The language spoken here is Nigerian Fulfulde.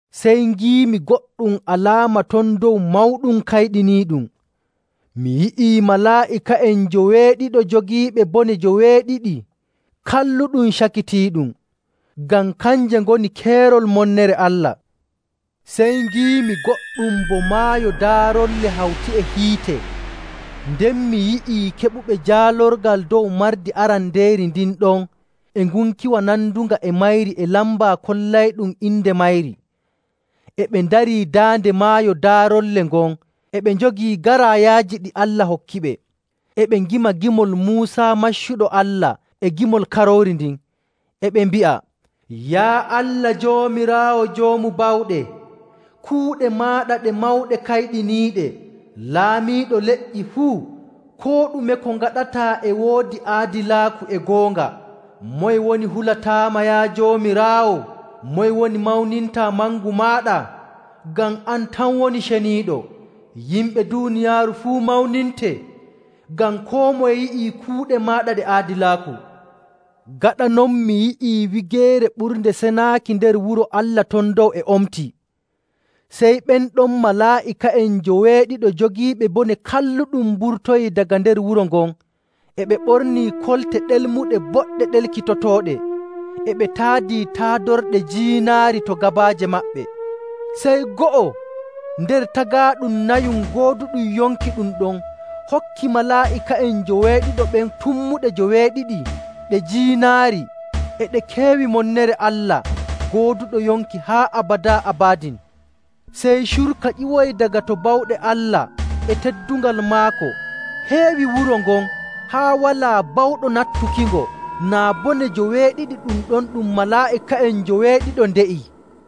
Sey ngiimi goɗɗum alaama ton dow mawɗum kayɗiniiɗum. Mi yi'ii malaa'ika'en njoweeɗiɗo jogiiɓe bone joweeɗiɗi kalluɗum cakitiiɗum, ngam kanje ngoni keerol monnere Allah. Sey ngiimi goɗɗum bo maayo daarolle hawti e hiite. Nden mi yi'i keɓuɓe jaalorgal dow mardi arandeeri ndin ɗon e ngunkiwa nandunga e mayri e lamba kollayɗum inde mayri. E ɓe ndarii daande maayo daarolle ngon e ɓe njogii garaayaaji ɗi Allah hokkiɓe. E ɓe ngima gimol Muusa maccuɗo Allah e gimol Karoori ndin, e ɓe mbi'a, “Yaa Allah Joomiraawo Joomu Bawɗe, kuuɗe maaɗa ɗe mawɗe kayɗiniiɗe. Laamiiɗo leƴƴi fuu, koo ɗume ko ngaɗataa e woodi aadilaaku e goonga! Moye woni hulataama, yaa Joomiraawo? Moye woni mawnintaa mangu maaɗa? Ngam an tan woni ceniiɗo. Yimɓe duuniyaaru fuu mawninte, ngam koo moye yi'ii kuuɗe maaɗa ɗe aadilaaku.” Gaɗa non mi yi'ii Wigeere Ɓurnde Senaaki nder wuro Allah ton dow e omtii. Sey ɓen ɗon malaa'ika'en njoweeɗiɗo jogiiɓe bone kalluɗum mburtoyii daga nder wuro ngon e ɓe ɓornii kolte ɗelmuɗe boɗɗe ɗelkitotooɗe, e ɓe taadii taadorɗe jiinaari to gabaaje maɓɓe. Sey go'o nder tagaaɗum nayum gooduɗum yonki ɗum ɗon hokki malaa'ika'en njoweeɗiɗo ɓen tummuɗe joweeɗiɗi ɗe jiinaari e ɗe keewi monnere Allah gooduɗo yonki haa abadaa abadin. Sey curka ƴiwoyi daga to bawɗe Allah e teddungal maako heewi wuro ngon haa walaa bawɗo nattukingo naa bone joweeɗiɗi ɗum ɗon ɗum malaa'ika'en njoweeɗiɗo nde'ii.